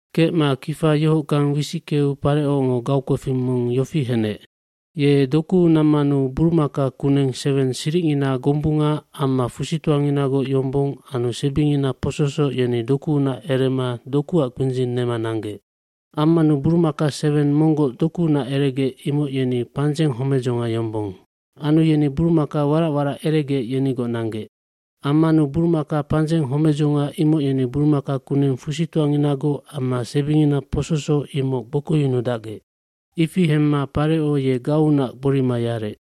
Kecma kifa yohockang wisickeu Parecongo gaukpefing mong yofi henec. burumaka kuneng seweng siricngina gombunga amma fusitoanginagoc yombong anu sebingina pososoc yeni dokuunac erema dokuac kpindzing nema nanggec. Ammanu burumaka seweng monggoc dokuunac eregec imoc yeni pandzeng homedzonga yombong. Anu yeni buramaka warac warac eregec yenigoc nanggec. Ammanu burumaka pandzeng homedzonga imoc yeni burumaka kuneng fusitoanginagoc amma sebingina pososoc imoc gbokoyunudacgec. Ifi hemma Pareco ye gaunac gborima yarec.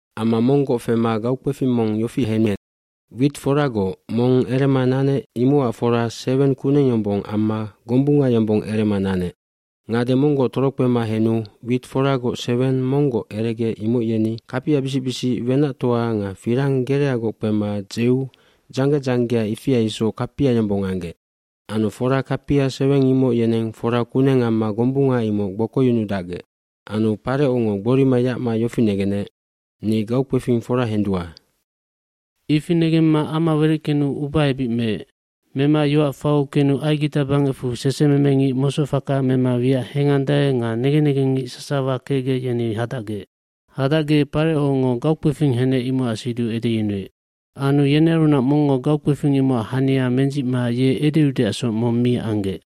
Amma monggoc fema gaukpefing mong yofi henec, wit foragoc mong erema nanec imocac fora seweng kuneng yombong amma gombunga yombong erema nanec. Ngade monggoc torokpema henu wit foragoc seweng monggoc eregec imoc yeni kapiabisic bisic wenactoa nga firang gereagoc kpema dzeu dzangge dzanggea ifia isoc kapia yombong anggec. Anu fora kapia seweng imoc yeneng fora kuneng amma gombunga imoc gbokoyunudacgec. Anu Parecongo gborima yacma yofi negenec, “Ni gaukpefing fora hendua.” bIfi negemma ama wereckenu ubaebic meec. Mema yoac fau kenu Aigita bangecfu sesememengic mosocfaka mema wiac hengandae nga negen negengngic sasawa kecgec yeni hadacgec. Hadacgec Parecongo gaukpefing henec imocac siduc edeyunuec. Anu yenearunac mongngo gaukpefing imocac hania mendzicma ye edeudeacsoc mong mi anggec.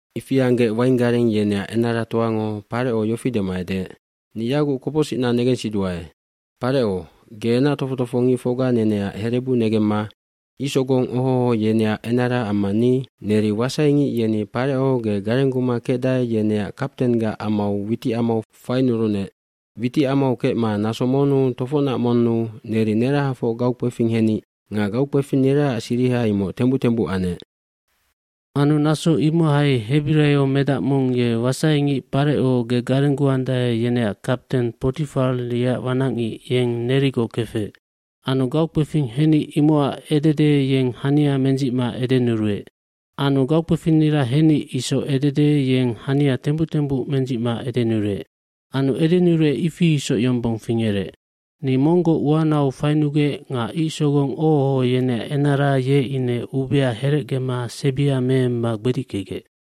Ifi anggec wainggareng yeneac enaratoango Pareco yofi dema edeec, “Ni yaguc kopocsicna negensiduae. Pareco, ge enac tofoc tofohongicfocga neneac herebu negemma icsogong oho oho yeneac enara amma ni, neri wasaingic yeni Pareco ge garengguma kecdae yeneac kaptenggac amau witicamau fainurunec. Witicamau kecma naso monnu tofocnac monnu neri nerahafoc gaukpefing henic nga gaukpefinniraac siriha imoc tembuc tembuc anec. Anu naso imohai hebiraiomedac mong ye wasaingic Pareco, ge garengguandae yeneac kapten Potifar yeac wanacngic yeng nerigoc kefec. Anu gaukpefing henic imocac edede yeng hania mendzicma edenuruec. Anu gaukpefinnira henic isoc edede yeng hania tembuc tembuc mendzicma edenuruec. Anu edenuruec ifi isoc yombong fingerec. Ni monggoc uanau fainugec nga icsogong oho oho yeneac enara ye ine ubia herecgema sebia meemma gbedickegec.”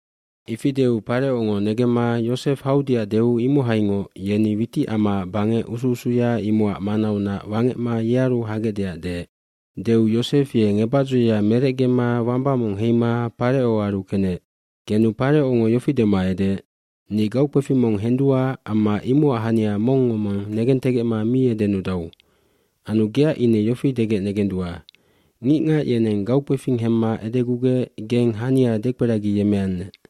Ifi deu Parecongo negemma Yosef haudeac deu imohaingoc yeni witicamaac bangec usu usuya imocac manaunac wangecma yearu hagecdeac deec. Deu yosef ye ngebacdzoya merecgema wamba mong heima Parecoaru kenec. Kenu Parecongo yofi dema edeec, “Ni gaukpefing mong hendua amma imocac hania mongngo mong negentegecma mi edenudau. Anu geac ine yofi degec negendua, ‘Ngicngac yeneng gaukpefing hemma edegugec geng hania dekperagiyemmeannec.’”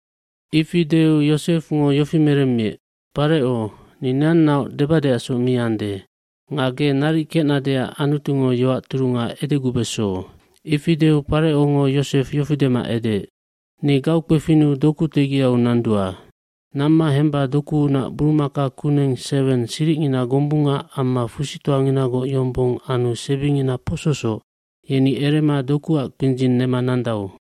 cIfi deu Yosefngo yofi meremmiec, “Pareco, ni neannaoc debadeacsoc mi ande. Nga ge naric kecnadeac Anutungo yoac turunga edegubeso.” Ifi deu Parecongo Yosef yofi dema edeec, “Ni gaukpefinnu doku tegiau nandua. Namma hemba dokuunac burumaka kuneng seweng siricngina gombunga amma fusitoanginagoc yombong anu sebingina pososoc yeni erema dokuac kpindzing nema nandau.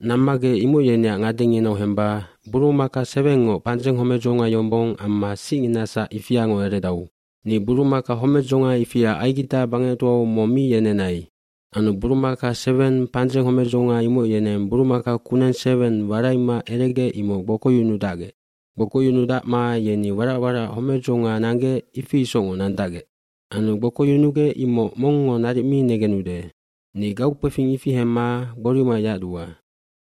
Nammagec imoc yeneac ngadenginau hemba burumaka sewengngoc pandzeng homedzonga yombong amma sicnginasac ifiango eredau. Ni burumaka homedzonga ifia Aigita bangectoau mong mi yenenai. Anu burumaka seweng pandzeng homedzonga imoc yeneng burumaka kuneng seweng waraima eregec imoc gbokoyunudacgec. Gbokoyunudacma yeni warac warac homedzonga nanggec ifi isocngoc nandacgec. Anu gbokoyunugec imoc mongngo naric mi negenude. Ni gaukpefing ifi hemma gborima yacdua.”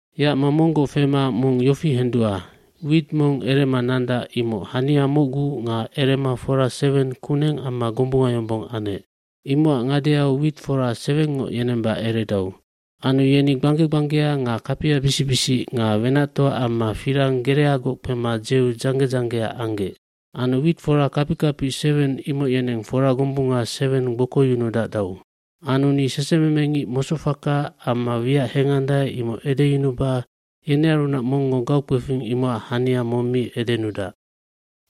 “Yacma monggoc fema mong yofi hendua, wit mong erema nandac imoc hania mocgu nga erema fora seweng kuneng amma gombunga yombong anec. Imocac ngadeau witfora sewengngoc yenemba eredau. Anu yeni gbangge gbanggea nga kapiabisic bisic nga wenactoa amma firang gereagoc kpema dzeu dzangge dzanggea anggec. Anu witfora kapic kapic seweng imoc yeneng fora gombunga seweng gbokoyunudacdau. Anu ni sesememengic mosocfaka amma wiac hengandae imoc edeyunuba yenearunac mongngo gaukpefing imocac hania mong mi edenudac.”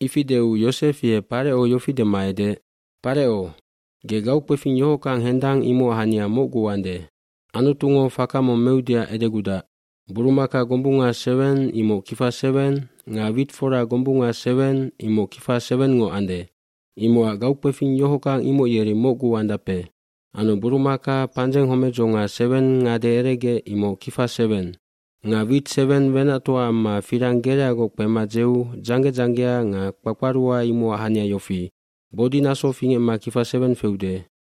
Ifi deu Yosef ye Pareco yofi dema edeec, “Pareco, ge gaukpefing yohockang hendang imocac hania mocgu ande. Anutungo faka mong meudeac edegudac. Burumaka gombunga seweng imoc kifa seweng nga witfora gombunga seweng imoc kifa sewengngoc ande. Imocac gaukpefing yohockang imoc yeri mocgu andape. Anu burumaka pandzeng homedzonga seweng ngade eregec imoc kifa seweng. Nga wit seweng wenactoa amma firang gereagoc kpema dzeu dzangge dzanggea nga kpakparua imocac hania yofi, bodinaso fingecma kifa seweng feude.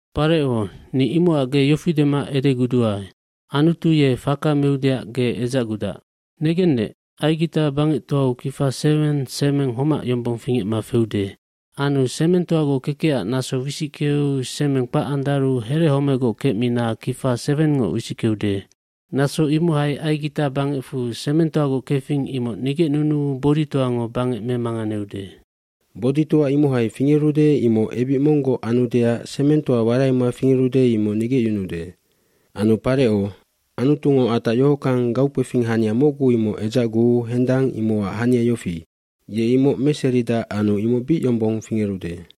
Pareco, ni imocac ge yofi dema edeguduae Anutu ye faka meudeac ge edzacgudac. Negennec, Aigita bangectoau kifa seweng semeng homac yombong fingecma feude. Anu semengtoagoc kekecac naso wisickeu semeng kpac andaru herehomegoc kecmina kifa sewengngoc wisickeude. Naso imohai Aigita bangecfu semengtoagoc kefing imoc nigecnunuu boditoango bangec memanganeude. Boditoa imohai fingerude imoc ebic monggoc anudeac semengtoa waraima fingerude imoc nigecyunuude. Anu Pareco, Anutungo atac yohockang gaukpefing hania mocgu imoc edzacguu hendang imocac hania yofi, ye imoc meseridac anu imoc bic yombong fingerude.”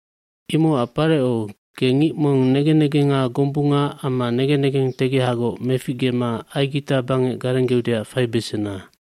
“Imocac Pareco, ge ngic mong negen negenga gombunga amma negen negentegehagoc meficgema Aigita bangec garenggeudeac faibesena.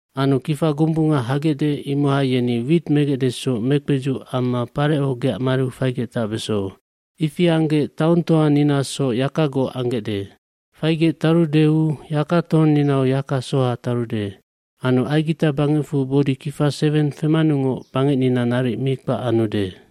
Anu kifa gombunga hagecde imohai yeni wit megecdesoc mekpedzuc amma Pareco geac mariu faigec tacbeso. Ifi anggec taongtoatoaninasoc yakagoc anggecde. Faigec tarudeu yakatohongnginau yaka soha tarude. Anu Aigita bangecfu bodi kifa seweng femanungoc bangecnina naric mi kpac anude.”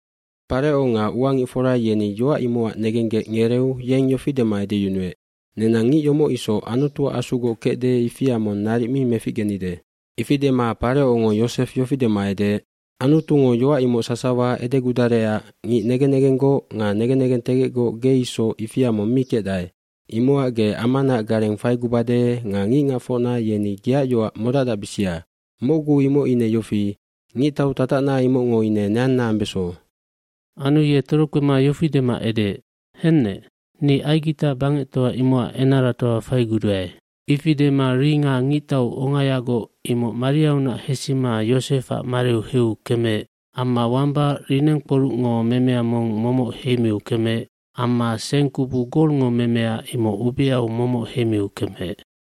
Pareco nga uangicfora yeni yoac imocac negenggec ngereu dyeng yofi dema edeyunuec, “Nenang ngic yomoc isoc Anutuac Asugoc kecde ifia mong naric mi meficgenide.” Ifi dema yeng Yosef yofi dema edeec, “Anutungo yoac imoc sasawa edegudarecac ngic negen negenggoc nga negen negentegecgoc ge isoc ifia mong mi kecdae. eImocac ge amanaac gareng faigubade nga ngicngacfocna yeni geac yoac modacdacbisia. Mocgu imoc ine yofi, ngictau tatacna imocngo ine neanna ambeso.” fAnu ye torokpema yofi dema edeec, “Hennec, ni Aigita bangectoa imocac enaratoa faiguduae.” hIfi dema ringa ngictau ongayagoc imoc mariaunac hesima Yosefac mariu heu kemeec amma wamba linengkporucngog memea mong momoc heimiu kemeec amma seng kubu golngo memea imoc ubeau momoc heimiu kemeec.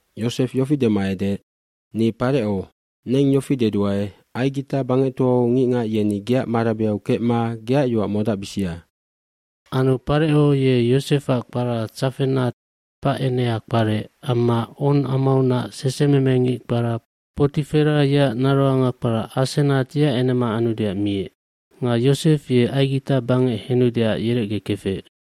Yosef yofi dema edeec, “Ni Pareco, neng yofi deduae Aigita bangectoau ngicngac yeni geac marabeau kecma geac yoac modacbisia.” Anu Pareco ye Yosefac kpara Tsafenat Pacenea kparec amma On amaunac sesememengic kpara Poti Fera yeac naroanga kpara Asenat yeac enema anudeac miec. Nga Yosef ye Aigita bangec henudeac yerecgekefec.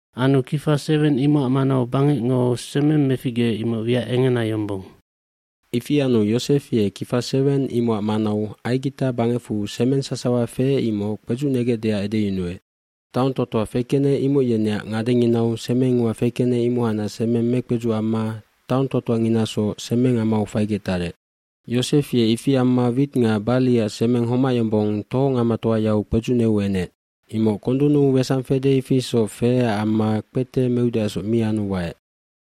Anu kifa seweng imocac manau bangecngo semeng meficgeec imoc wiac engena yombong. Ifi anu Yosef ye kifa seweng imocac manau Aigita bangecfu semeng sasawa feec imoc kpedzucnegecdeac edeyunuec. Taontoatoa fekenec imoc yeneac ngadenginau semeng ua fekenec imohacnac semeng mekpedzuc amma taongtoatoanginasoc semengamau faigec tarec. Yosef ye ifi amma wit nga barliac semeng homac yombong tohongamatoayau kpedzucneu enec. Imoc kondunnu sangi fede ifi isoc feecac amma kpete meudeacsoc mi anu waec.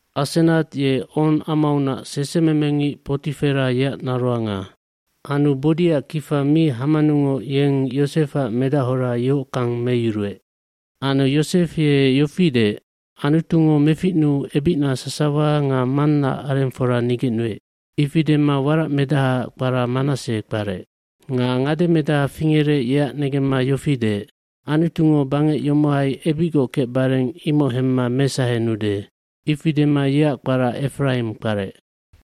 Asenat ye On amaunac sesememengic Poti Fera yeac naroanga. Anu bodiac kifa mi hamanungoc yeng Yosefac medachora yohockang meyuruec. Anu Yosef ye yofi deec, “Anutungo meficnuu ebicna sasawa nga mannaac arengfora nigecnuec.” Ifi dema warac medahaac kpara Manassej kparec. Nga ngademedaha fingerec yeac negemma yofi deec, “Anutungo bangec yomohai ebicgoc kecbareng imoc hemma mesahenude.” Ifi dema yeac kpara Efraimk kparec.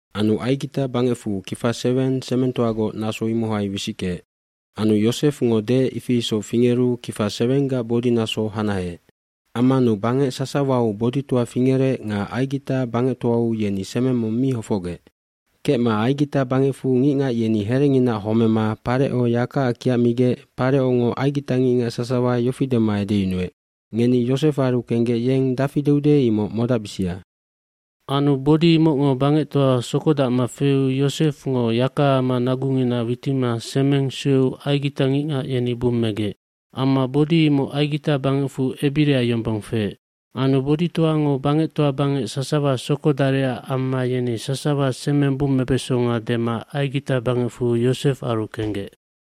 Anu Aigita bangecfu kifa seweng semengtoagoc naso imoc wisickeec. lAnu Yosefngo deec ifi isoc fingeru kifa sewenggac bodinaso hanaheec. Ammanu bangec sasawau boditoa fingerec nga Aigita bangectoau yeni semeng mong mi hofocgec. mKecma Aigita bangecfu ngicngac yeni herenginaac homema Pareco yakaac kiacmigec Parecongo aigitangicngac sasawa yofi dema edeyunuec, “Ngeni Yosefaru kenggec yeng dafi deude imoc modacbisia.” Anu bodi imocngo bangectoa sokodacma feu Yosefngo yakaama nagungina witima semeng sueu aigitangicngac yeni bummegec. Amma bodi imoc Aigita bangecfu ebira yombong feec. Anu boditoango bangectoa bangec sasawa sokodarecac amma yeni sasawa semeng bummebesonga dema Aigita bangecfu Yosefaru kenggec.